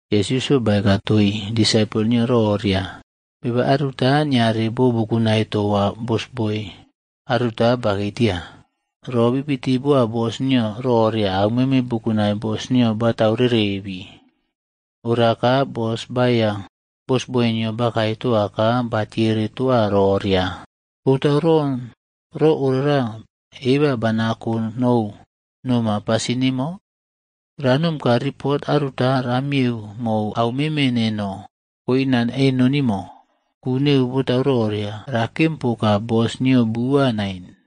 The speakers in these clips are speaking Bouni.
Yesusꞌyo baeka toii disaipol nio roria, “Beba aruta niare bo bukunai toa bosboi aruta bakei tia. Ro bibiti boa bos nio roria auꞌmeme bukunai bos nio batau rerebii. Ora ka bos baeiya bosboi nio bakae toa ka batiere toa roria, ‘Botau ron ro ora eba banako nou noma pasin nemo? Ranom ka ripot aruta ramiyeu mou au meme nino koina eno nimo. Ku neu botau roria. Rakem poka bosboi nino bua nain.’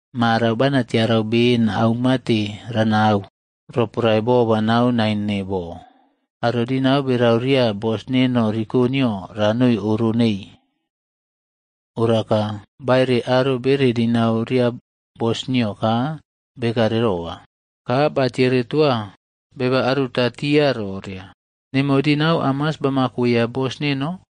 Marau bana tiarau beni aumate ranau, roporae bo banau naine bo. Aro dinau berau ria bos neno riko nino ranoni oro nei.’ “Ora ka baere aro bere dinau ria bos nio ka bekare roa. Ka batiere toa beba aruta tia roria, ‘Nemo dinau hamas bamakoya bos neno?’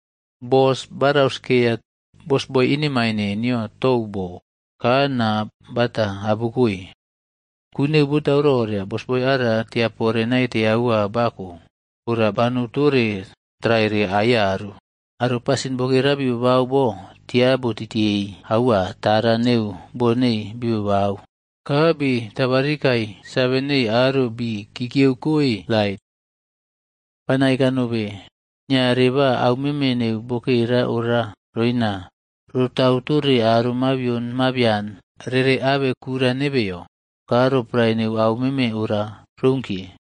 “Bos ba rauskeya bosboi inemaine nio tou bo, ka na bata abukoe. Ku neu botau roria bosboi ara tia pore naite aua bako ora banou tore traiya aiyaru. Aro pasin bokera bi babau bo tia botitiyei aua tara neu bo nei bibabau, ka bi tabarikai save neii aro bi kikiyeukoe lait. Bana eka nobe, niare ba au meme neu bokera ora roina rotau tore aro mabion mabian rere abe kura nebeyo. Ka roporae neu au meme ora rounkiye,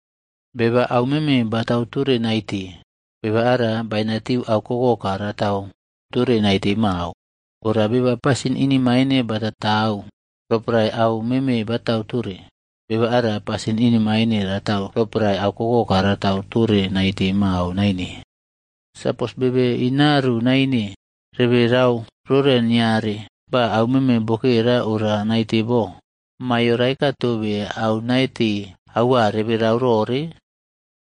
“Beba au meme batau tore naite, beba ara bainatiu au kokoka ratau tore naite mao. Ora beba pasin inemaine bataꞌtau roporae au meme batau tore, beba ara pasin inemaine ratau roporae au kokoka ratau tore naite mao naine. Sapos bebe inariu naine rebe rau rore niare ba aumeme bokera ora naite bo, maiyo raeka tobe au naite aua rebe rau rore?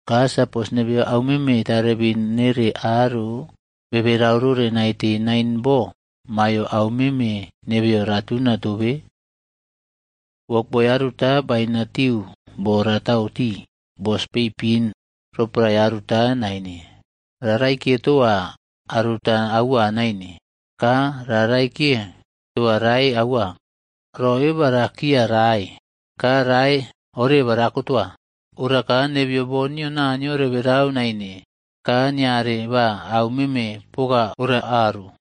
Ka sapos nebeyo auꞌmeme tarebin nere aro bebe rau rore naite nain bo maiyo auꞌmeme nebeyo ratuna tobe? “Wokboi aruta bainatiu bo ratau tii bos peipin roporae aruta naine. Ra raikiye toa aruta aua naine, ka ra raikie toa rae aua. Ro eba rakiya rae, ka rae oreba rako toa. Ora ka nebeyo bo nio Naniyo reberau naine ka niare ba au meme poka ora aru.”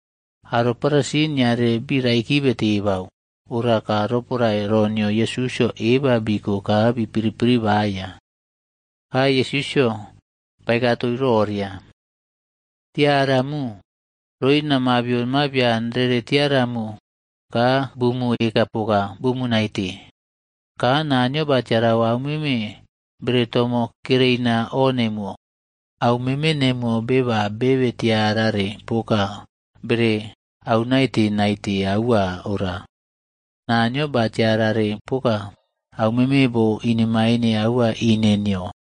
Aro Farisi niare bi raikibe tebau. Ora ka roporae ro nio Yesusꞌyo eba biko ka bi piri piri baya. Ka Yesusꞌyo baeka toii roria, “Tiaramu roina mabion mabian rere tiaramu ka bumu, eka poka bumu naite. Ka Naniyo ba tiarau aumeme bere tomo kereina o nemuwo. Au meme nemuwo beba bebe tiarare poka bere au naite naite aua ora, Naniyo ba tiarare poka aumeme bo inemaine aua ine nio.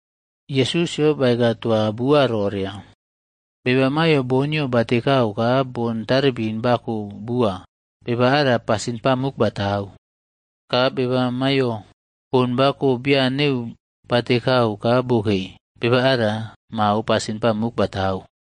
Yesusꞌyo baeka toa bua roria, “Beba maiyo bon nio batekau ka bon taribin bako bua, beba ara pasin pamuk batau. Ka beba maiyo bon bako bian neu batekau ka bokei, beba ara mao pasin pamuk batau.”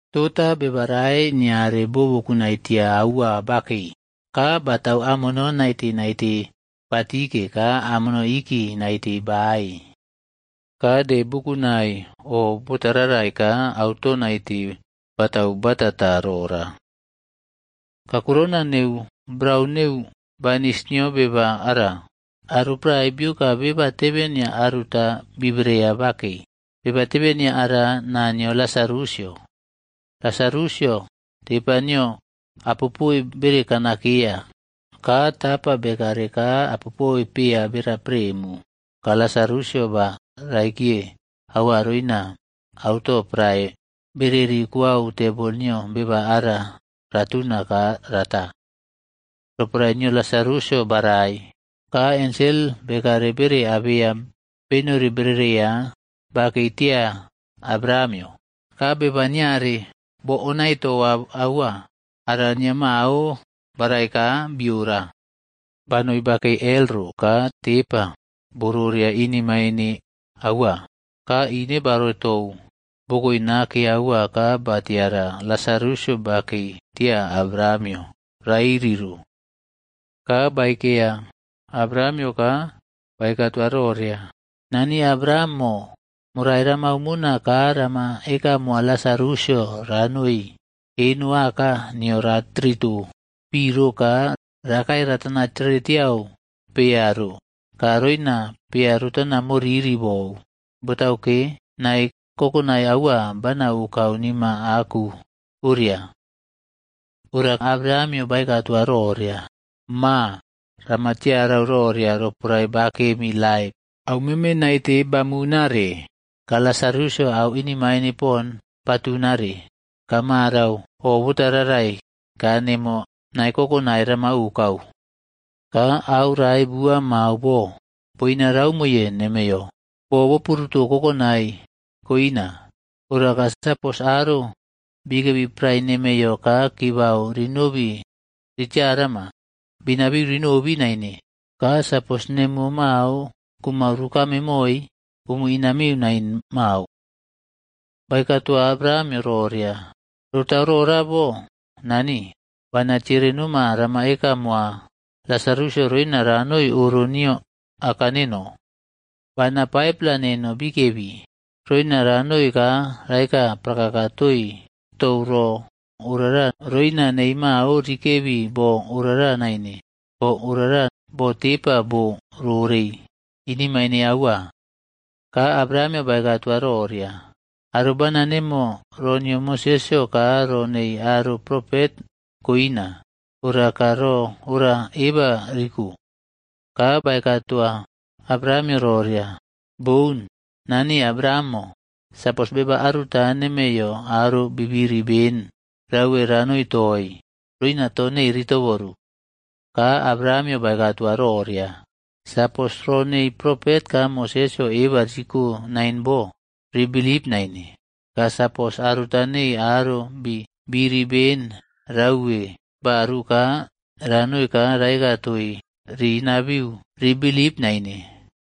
“Tota beba rae niare bo bukunai tia aua bakei, ka batau amono naite naite ba tike ka amono iki naite bae. Ka de bukunai o botararai ka auto naite batau batata rora. Kakurouna neu brau neu banis nio beba ara, aro prae bioka beba tebenia aruta bibreya bakei.e Beba tebenia ara, naa nio Lasarusꞌyo. Lasarusꞌyo, tepa nio apopoe bere kanakeya, ka tapa bekare ka apopoe pea bera premu. Ka Lasarusꞌyo ba raikiye aua roina auto prae bereri kuwau tebol nio beba ara ratunare ka rata. “Roporae nio Lasarusꞌyo barai, ka ensel bekare bere abeya benori berereiya bakei tia Abrahamꞌyo.f Ka beba niare boꞌonai toa aua ara nia mao barai ka bi ora. Banoi bakei bo aro bibirig ro ka tepa bo roroea ine maine aua. Ka ine baore tou bokoe nake aua ka ba tiara Lasarusꞌyo bakei tia Abrahamꞌyo rairi ro. Ka baei keya Abrahamꞌyo ka baeka toa roria, ‘Nani Abrahamꞌmo, morai ramau mona ka rama eka moa Lasarusꞌyo ranoi eno aka nio ra trito pi ro ka rakae ratana tere tiau pea ro ka roina pea rotana moriri bou, botauke nae kokonae aua bana okau nima aku oria.’ “Ora Abrahamꞌyo baeka toa roria, ‘Ma, rama tiarau roria roporae bakem laip, auꞌmeme naite bamunare. Ka Lasarusꞌyo au inemaine pon batunare. Ka marau o bota rarai ka nemo nae kokonai rama okau. Ka au rae bua mao bo, boina raumo nemeiyo, bo boporuto kokonai koina. Ora ka, sapos aro bikebi prae nemeiyo ka kibau rinobi ritiaramu, bi inabiu ri nobi naine. Ka sapos nemuwo mao kumau rukame moi, bumu inaniu nain mao.’ “Baeka toa Abrahamꞌyo roria, ‘Rotau rora bo, nani, bana tiere noma rama eka moa Lasarusꞌyo roina ranoi oro nio aka neno. Bana 5-pla neno kikebi. Roina ranoi ka raeka prakaka toii tou ro orara roina nei mao rikabe bo orara naine. Bo orara bo tepa bo rorei inemaine aua.’ “Ka Abrahamꞌyo baeka toa roria, ‘Aro bana nemo ro nio Mosesꞌyo ka ro neii aro propet koina. Ora ka ro ora eba riko.’ “Ka baeka toa Abrahamꞌyo roria, ‘Boun, Nani Abrahamꞌo, sapos beba aruta nemeiyo aro bi biri beni rauwe ranoi toii, roina to nei ri toboru.’ “Ka Abrahamꞌyo baeka toa roria, ‘Sapos ro neii propet ka Mosesꞌyo eba riko nain bo, rii bilip naine. Ka sapos aruta nei aro bi biri ben rauwe baru ka ranoi ra eka toii, ri inabiu ri bilip naine.’”